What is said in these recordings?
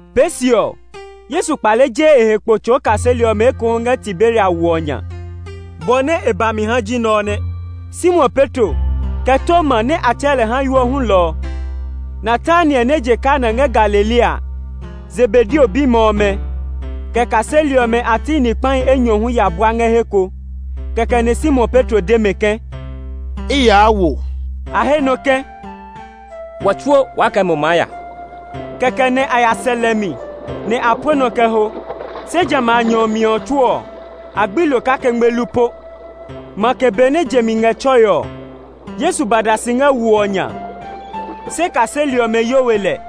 Pee se ɔ, Yesu kpale je e he kpo tsɔɔ kaseli ɔmɛ ekohu ngɛ Tiberia wo ɔ nya. Bɔ nɛ e ba mi ha ji nɛ ɔ nɛ. Simon Petro, kɛ Toma nɛ a tsɛɛ lɛ Hayo hulɔ ɔ, Natanael nɛ je Kana ngɛ Galilea a, Zebedeo bimɛ ɔmɛ, kɛ kaseli ɔmɛ a ti ni kpahi enyɔ hu ya bua ngɛ he ko. Kɛkɛ nɛ Simon Petro de mɛ ke, “I yaa wo.” A he nɔ ke, “Wɔ tsuo waa kɛ mo maa ya.” Kɛkɛ nɛ a ya sɛ lɛ mi, nɛ a pue nɔ kɛ ho. Se jamɛ a nyɔ ɔ mi tsuo ɔ, a gbi lo kake ngmelu po. Makɛ benɛ je mi ngɛ tsɔe ɔ, Yesu ba da si ngɛ wo ɔ nya, se kaseli ɔmɛ yo we lɛ.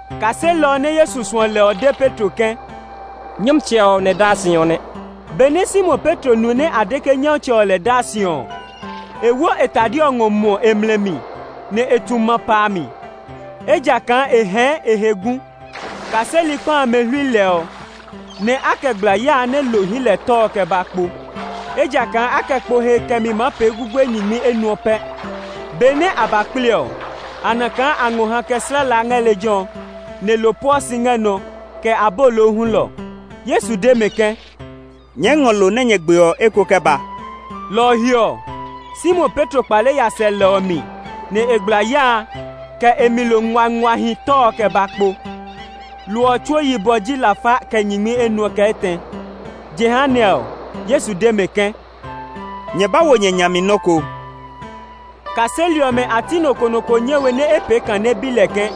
Kaselɔ nɛ Yesu suɔ lɛ ɔ de Petro ke, “Nyɔmtsɛ ɔ nɛ daa si ɔ nɛ.” Benɛ Simon Petro nu nɛ a de ke Nyɔmtsɛ ɔ lɛ daa si ɔ, e wo e tade ɔ ngɔ muɔ e mlɛ mi, nɛ e tu ma pa a mi, ejakaa e hɛɛ e he gu. Kaseli kpa amɛ hlui lɛ ɔ, nɛ a kɛ gbla ya a nɛ lo hyi lɛ tɔ ɔ kɛ ba kpo, ejakaa a kɛ kpo he kɛmi maa pee gugue nyingmi enuɔ pɛ. Benɛ a ba kple ɔ, a na kaa a ngɔ hã kɛ slɛ la ngɛ lejɛ ɔ, nɛ lo pueɔ si ngɛ nɔ, kɛ abolo hulɔ. Yesu de mɛ ke, “Nyɛɛ ngɔ lo nɛ nyɛ gbe ɔ eko kɛ ba.” Lɔ ɔ he ɔ, Simon Petro kpale ya sɛ lɛ ɔ mi, nɛ e gbla ya a, kɛ e mi lo nguanguahi tɔ ɔ kɛ ba kpo. Lo ɔ tsuo yibɔ ji lafa kɛ nyingmi enuɔ kɛ etɛ. Jehanɛ ɔ, Yesu de mɛ ke, “Nyɛ ba wo nyɛ nya mi nɔ́ ko.” Kaseli ɔmɛ a ti nɔ ko nɔ ko nyɛ we nɛ e pee kã nɛ e bi lɛ ke,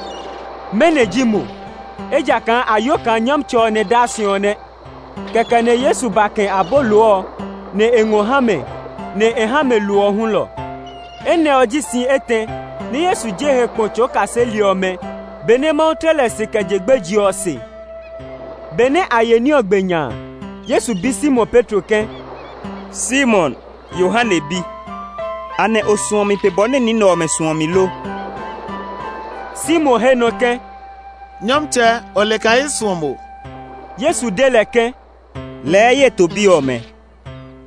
“Mɛnɔ ji mo?” Ejakaa a yo kaa Nyɔmtsɛ ɔ nɛ daa si ɔ nɛ. Kɛkɛ nɛ Yesu ba kɛ̃ abolo ɔ, nɛ e ngɔ ha mɛ. Nɛ e ha mɛ lo ɔ hulɔ. Enɛ ɔ ji si etɛ nɛ Yesu je e he kpo tsɔɔ kaseli ɔmɛ benɛ Mawu tle lɛ si kɛ je gbeje ɔ se. Benɛ a ye ní ɔ gbe nya a, Yesu bi Simon Petro ke, “Simon, Yohane bi, anɛ o suɔ mi pe bɔ nɛ ni nɛ ɔmɛ suɔ mi lo?” Simon he nɔ ke, “Nyɔmtsɛ, o le kaa i suɔ mo!” Yesu de lɛ ke, “Lɛɛ ye to bi ɔmɛ.”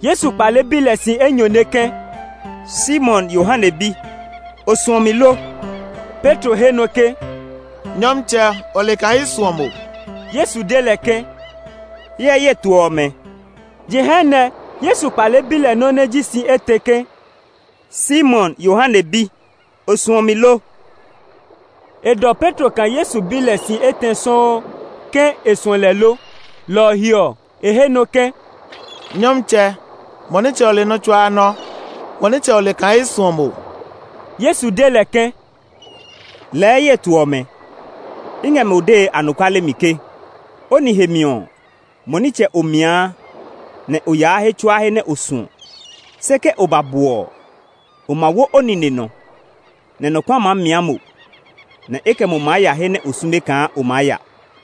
Yesu kpale bi lɛ si enyɔne ke, “Simon, Yohane bi, o suɔ mi lo?” Petro he nɔ ke, “Nyɔmtsɛ, o le kaa i suɔ mo!” Yesu de lɛ ke, “Hyɛ ye to ɔmɛ.” Jehanɛ Yesu kpale bi lɛ nɔ́ nɛ ji si etɛ ke, “Simon, Yohane bi, o suɔ mi lo?” E dɔ Petro kaa Yesu bi lɛ si etɛ sɔuu ke e suɔ lɛ lo. Lɔ ɔ he ɔ, e he nɔ ke, “Nyɔmtsɛ, mo nitsɛ o le nɔ́ tsuaa nɔ́; mo nitsɛ o le kaa i suɔ mo!” Yesu de lɛ ke, “Lɛɛ ye to ɔmɛ. I ngɛ mo dee anɔkuale mi ke o nihe mi ɔ, mo nitsɛ o miaa, nɛ o yaa he tsuaa he nɛ o suɔ. Se ke o ba bwɔ ɔ, o ma wo o nine nɔ, nɛ nɔ kpa maa mia mo; nɛ e kɛ mo maa ya he nɛ o sume kaa o maa ya.”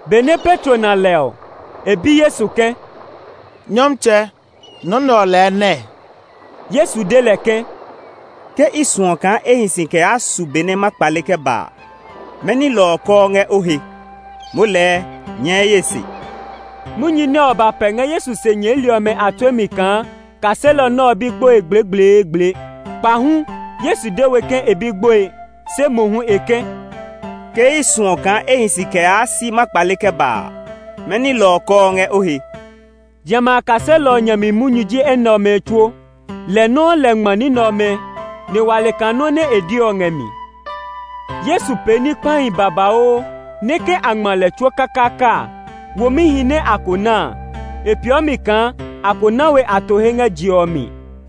Benɛ Petro na lɛ ɔ, e bi Yesu ke, “Nyɔmtsɛ, nɔ nɛ ɔ lɛɛ nɛɛ?” Yesu de lɛ ke, “Ke i suɔ kaa e hi si kɛ yaa su be nɛ ma kpale kɛ ba a, mɛni lɔ ɔ kɔɔ ngɛ o he? Moo lɛɛ nyɛɛ ye se!” Munyu nɛ ɔ ba pɛ ngɛ Yesu se nyɛɛli ɔmɛ a tue mi kaa kaselɔ nɛ ɔ be gboe gblegbleegble. Kpahu Yesu de we ke e be gboe; se mohu e ke, “Ke i suɔ kaa e hi si kɛ yaa si ma kpale kɛ ba a, mɛni lɔ ɔ kɔɔ ngɛ o he?” Jamɛ a kaselɔ ɔ nya mi munyu ji enɛ ɔmɛ tsuo. Lɛ nɔuu lɛ ngma ní nɛ ɔmɛ; nɛ wa le kaa nɔ nɛ e de ɔ ngɛ mi. Yesu pee ní kpahi babauu, nɛ ke a ngma lɛ tsuo kakaaka a, womihi nɛ a ko ná a, e peeɔ mi kaa, a ko na we a to he ngɛ je ɔ mi.